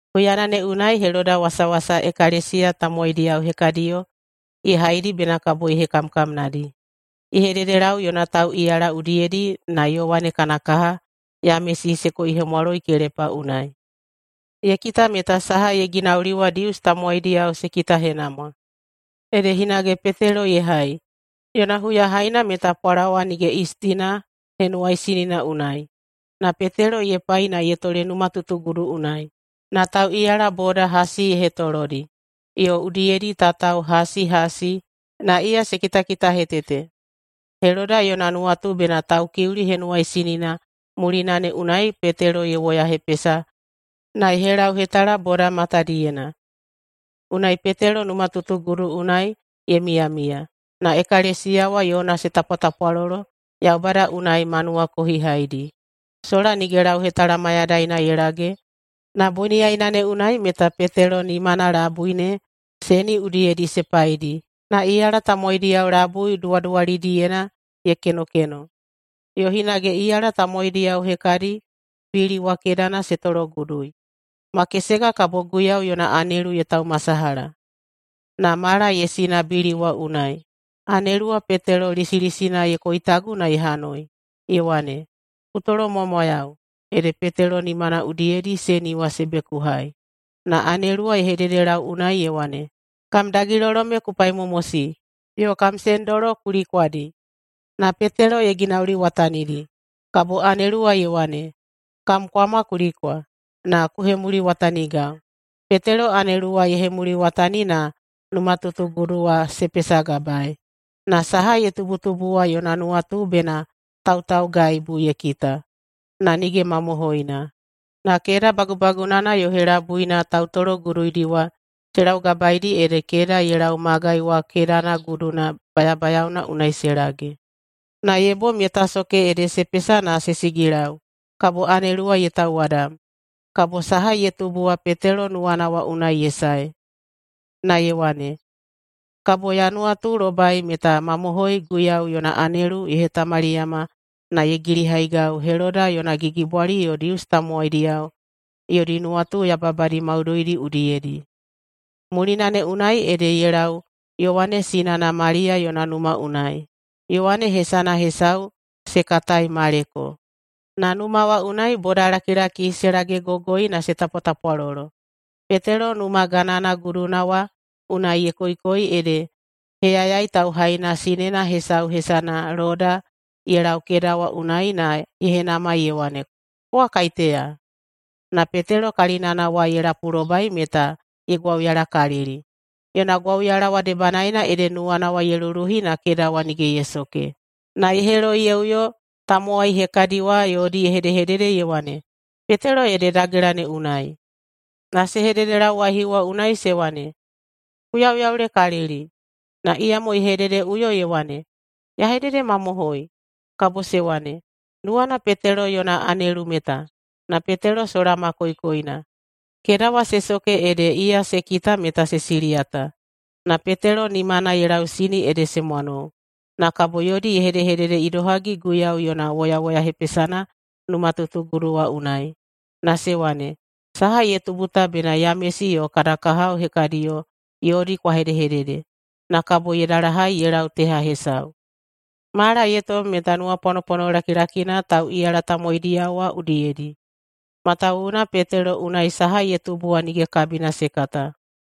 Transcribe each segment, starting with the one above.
Huyana ne unai Heloda wasawasa ekalesiya tamowaidiyao hekadiyo ye haidi bena kabo ye hekamkamnadi. Ye hededelau yona tauꞌiyala udiyedi na Yowane kana kaha Yamesi se koihemwaloi kelepa unai. Ye kita meta saha ye ginauli wa Dius tamowaidiyao se kitahenamwa, ede hinage Petelo ye hai. Yona huyahaina meta Pwalawa nige Yistina Henuwaisinina unai. Na Petelo ye pai na ye tole numatutugudu unai. Na tauꞌiyala boda hasi ye hetolodi, yo udiyedi tatao hasi hasi, na iya se kitakitahetete. Heloda yona nuwatu bena Taukiuli Henuwaisinina mulina ne unai Petelo ye woyahepesa na ye helauhetala boda matadiyena. Unai Petelo numatutugudu unai ye miyamiya, na ekalesiya wa yona se tapwatapwalolo Yaubada unai ma nuwakohihaidi. Sola nige lauhetala mayadaina ye lage, na boniyaina ne unai meta Petelo nimana labui ne seni udiyedi se paidi na iyala tamowaidiyao labui duwaduwalidiyena ye kenokeno, yo hinage iyala tamowaidiyao hekadi bili wa kedana se tologudui. Makesega kabo Guiyau yona anelu ye taumasalaha, na mala ye sina bili wa unai. Anelu wa Petelo lisilisina ye koitagu na ye hanoi, ye wane, “Ku tolomwamwayau!” Ede Petelo nimana udiyedi seni wa se bekuhai. Na anelu wa ye hededelau unai ye wane, “Kam dagilolo me ku paimomosi yo kam sendolo ku likwadi!” Na Petelo ye ginauliwatanidi. Kabo anelu wa ye wane, “Kam kwama ku likwa, na ku hemuliwatanigau.” Petelo anelu wa ye hemuliwatani na numatutugudu wa se pesagabaei. Na saha ye tubutubu wa yona nuwatu bena tautaugaibu ye kita, na nige mamohoina. Na keda bagubagunana yo helabuina tautologuduidi wa se laugabaeidi ede keda ye lau magai wa kedana guduna bayabayaona unai se lage. Na ye bom ye tasoke ede se pesa na se sigilau, kabo anelu wa ye tauwadam. Kabo saha ye tubu wa Petelo nuwana wa unai ye sae, na ye wane, “Kabo ya nuwatulobai meta mamohoi Guiyau yona anelu ye hetamaliyama na ye gilihaigau Heloda yona gigibwali yo Dius tamowaidiyao yodi nuwatu yababadi maudoidi udiyedi.” Mulina ne unai ede ye lau Yowane sinana Maliya yona numa unai. Yowane hesana hesau se katai Maleko. Na numa wa unai bodalakilaki se lagegogoi na se tapwatapwalolo. Petelo numa ganana guduna wa unai ye koikoi ede heyayai tauhaina sinena hesau hesana Loda ye lau keda wa unai na ye henamai ye wane, “Kowa kaiteya?” Na Petelo kalinana wa ye lapulobai meta ye gwauyalakalili. Yona gwauyala wa debanaena ede nuwana ye luluhi na keda wa nige ye soke, na ye heloi ye uyo tamowai hekadi wa yodi ye hedehedede ye wane, “Petelo ede dagela ne unai!” Na se hededelau waihiu wa unai se wane, “Ku yauyaulekalili!” Na iyamo ye hedehededeꞌuyo ye wane, “Ya hededemamohoi!” Kabo se wane, “Nuwana Petelo yona anelu meta.” Na Petelo sola ma koikoina. Keda wa se soke ede iya se kita meta se siliyata. Na Petelo nimana ye lausini ede se mwanou. Na kabo yodi ye hedehedede idohagi Guiyau yona woyawoyahepesana numatutugudu wa unai. Na ye wane, “Saha ye tubu ta bena Yamesi yo kada kahao hekadiyo yodi kwa hedehedede.” Na kabo ye dalahai ye lau teha hesau. Mala ye tom meta nuwapwanopwano lakilakina tauꞌiyala tamowaidiyao wa udiyedi, matawuwuna Petelo unai saha ye tubu wa nige kabina se kata.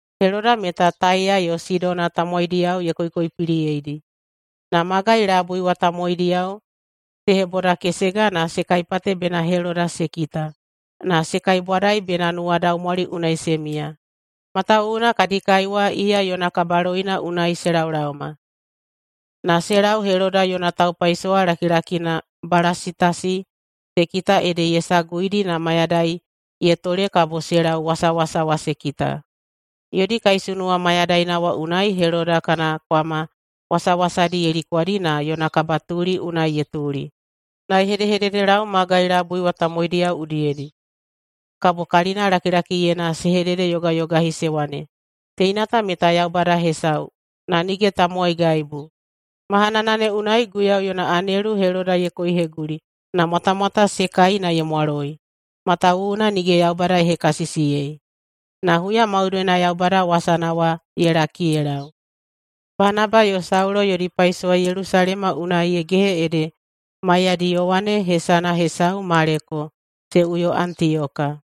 Heloda meta Taiya yo Sidona tamowaidiyao ye koikoipiliyeidi. Na magai labui wa tamowaidiyao se hebodakesega na se kaipate bena Heloda se kita na se kaibwadai bena nuwadaumwali unai se miya, matawuwuna kadi kai wa iya yona kabaloina unai se laolaoma. Na se lau Heloda yona taupaisowa lakilakina Balasitasi se kita ede ye saguidi na mayadai ye tole kabo se lau wasawasa wa se kita. Yodi kaisunuwa mayadaina wa unai Heloda kana kwama wasawasadi ye likwadi na yona kabatuli unai ye tuli, na ye hedehededelau magai labui wa tamowaidiyao udiyedi. Kabo kalinalakilakiyena se hededeyogayogahi se wane, “Teina ta meta yaubada hesau, na nige tamowaigaibu!” Mahanana ne unai Guiyau yona anelu Heloda ye koiheguli na mwatamwata se kai na ye mwaloi, matawuwuna nige Yaubada ye hekasisiyei. Na huya maudoina Yaubada wasana wa ye laki ye lau. Banaba yo Saulo yodi paisowa Yelusalema unai ye gehe ede maiyadi Yowane, hesana hesau Maleko, se uyo Antiyoka.